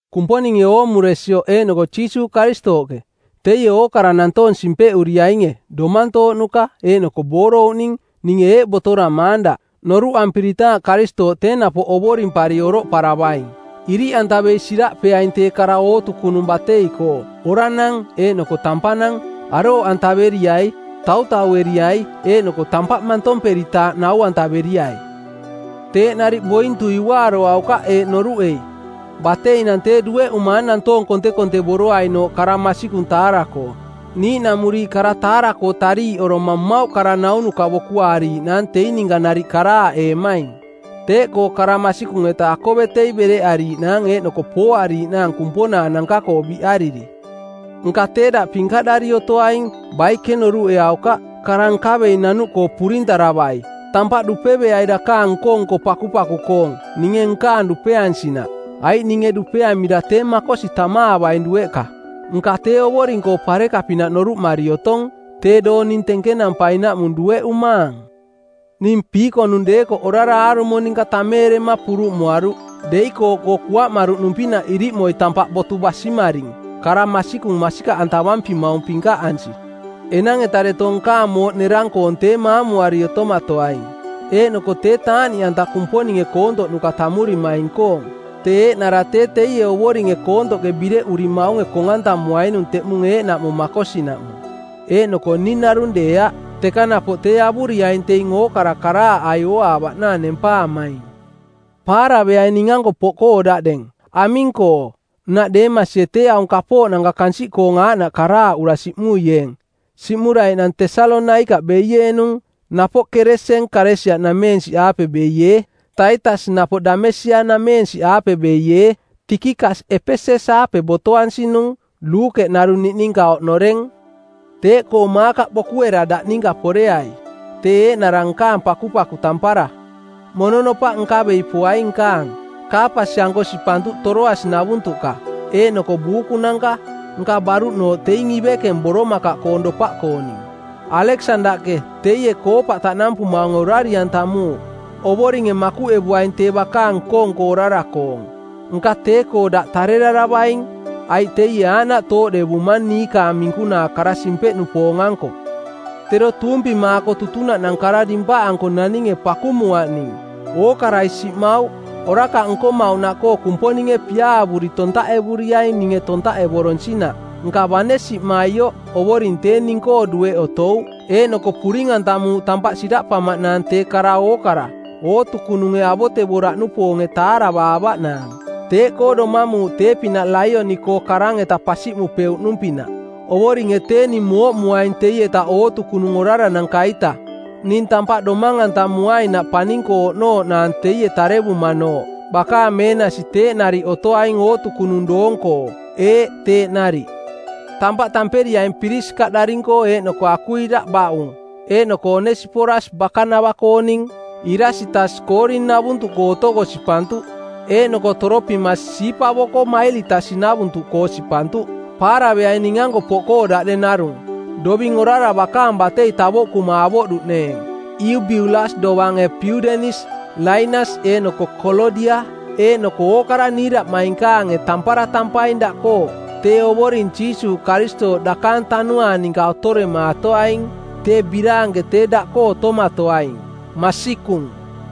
Kumponinge oomuresioꞌ eeꞌnoko Jiisuuꞌ Karistooꞌke, teie ookara nantoong simpeꞌuriainge, domantooꞌnuka eeꞌnoko boorouꞌning, ninge eeꞌ botoramaang daꞌ, noruꞌampiritaaꞌ Karistooꞌ tee napoꞌ ovorimpari oroꞌparavaing: Iriꞌantavei siraꞌpeaing tee kara ootukunung batei-koo, oranang eeꞌnoko tampanang. Arooꞌantaveriai, tautaueriai eeꞌnoko tampaꞌ mantomperitaaꞌ nau-antaveriai. Teeꞌ nariꞌ bointui uaaroaukaꞌ eeꞌ noruꞌei: Bateinang tee dueꞌumaang nantoong kontekontevoroainooꞌ kara masikung taara-koo. Niiꞌnamuriiꞌ kara taara-koo tariiꞌoroma mmauꞌ kara-naunuka bokuaariiꞌnaang teing ninka nariꞌ karaaꞌeemaing. Teeꞌkoo kara masikung-eta akovetei bereꞌariiꞌnaang eeꞌnoko pooariiꞌnaang kumponaananka-koo biꞌariri. Nka tee daꞌ pinkaꞌdari otoaing, baike noruꞌeaukaꞌ, kara nkavei nanuꞌkoo purintaravai, tampaꞌ dupeveai dakaang nko-nko pakupaku-koong, ninge nkaang dupeansinaꞌ. Aiꞌ ninge dupeamira tee makosi tamaavaing dueꞌka, nka tee Ovoring-koo pareka-pinaꞌ noruꞌmari otong. Tee doong ning tenkenampainaꞌmung dueꞌumaang. Ning piikonung deekoꞌ orara aarumo ninka tameerema puruꞌmuaruꞌ. Deikooꞌkoo kuaꞌmaruꞌnung-pinaꞌ iriꞌmoi tampaꞌ botu basimaring, kara masikung masikaꞌantavampimaung pinkaꞌansi. Enang-eta deto nkaang mooꞌ nerang-koong tee maamuari otomatoaing, eeꞌnoko tee taaꞌniꞌanta Kumponinge koontoꞌnuka tammurimaing-koong. Tee eeꞌnara tee teie Ovoringe koontoꞌke bireꞌurimaunge kong-antamuainung teꞌmung eeꞌnaꞌmung makosinaꞌmung, eeꞌnoko ning narung deeaꞌ, teka napoꞌ tee avuriaing teing ookara karaaꞌai ooaavaꞌnaang nempaamaing. Paaraveaing ning-anko poꞌkoo daꞌdeng. Aming-koo, nnaꞌ Deemasie tee aung kapooꞌnanka kansiꞌkoong aaꞌnaꞌ karaaꞌura siꞌmuieeng; siꞌmuraiꞌnang Tesalonaikaꞌ beieenung. Napoꞌ Keresen Kalesia-nameensiꞌaape beiee; Taitas napoꞌ Damesia-nameensiꞌaape beiee; Tikikas Epeses-aape botoansinung; Luukeꞌ narung niꞌninka oꞌnoreng; Teeꞌkoo Maakaꞌ bokuera daꞌninka poreai; tee eeꞌnara nkaang pakupaku tampara. Mononopaꞌ nkavei poai nkaang, Kaapas-anko sipantuꞌ Toroasi-navuntuꞌka, eeꞌnoko buukunanka, nka baruꞌnooꞌ teing ivekeng boromakaꞌkoong dopaꞌkooning. Aleksandaꞌke, teie koopaꞌ taꞌnampumaunge, orari-antamuuꞌ. Ovoringe makuꞌevuaing tee bakaang nko-nko orara-koong. Nka tee-koo daꞌ tareraravaing, aiꞌ teie aaꞌnaꞌ tooꞌdevumang niikaang minkunaa kara simpeꞌnupoong˜ anko. Tero tuumpimaako tutunaꞌnang kara dimpaꞌanko naninge pakumuaꞌ ning. Ookarai siꞌmauꞌ. Orakaꞌ nkomauꞌnaꞌkoo Kumponinge piaavuri tontaꞌevuriaing ninge tontaꞌevoronsinaꞌ. Nka bane siꞌmaioꞌ Ovoring tee ning-koo dueꞌ otouꞌ, eeꞌnoko puring-antamuuꞌ tampaꞌ siraꞌpamaꞌnaang tee kara ookara, ootukununge avotevoraꞌnupoonge taaravaavaꞌnaang. Teeꞌkoo domamuuꞌ tee-pinaꞌ laioni-koo karang-eta pasiꞌmupeuꞌnung-pinaꞌ. Ovoringe tee ning mooꞌmuaing teieta ootukunung orarananka-ita, ning tampaꞌ domang-antamuainaꞌ paning-koo oꞌnooꞌnaang teie tarevumanooꞌ. Bakaang meenasi teeꞌ nariꞌ otoaing ootukunung doong-koo. Ee, teeꞌ nariꞌ. Tampaꞌ tamperiaing Pirisikaꞌdaring-koo eeꞌnoko Akuila baꞌung, eeꞌnoko Onesiporas bakanava-kooning. Irasitas Koorin-navuntuꞌ otoko sipantuꞌ. Eeꞌnoko Toropimas siipavoko Mailitas-navuntuꞌka sipantuꞌ. Paaraveaing ning-anko poꞌkoo daꞌdeng narung, doving orara bakaang batei tavoꞌkuma avoꞌduꞌneeng. Iubiulas dovange Piudenis, Lainas eeꞌnoko Kolodia eeꞌnoko ookara niiraꞌmainkaange tampara tampaing daꞌkoo. Tee Ovoring Jiisuuꞌ Karistooꞌ dakaang tanuaang ninka otoremaatoaing. Tee biraanke tee daꞌkoo otomatoaing. Masikung.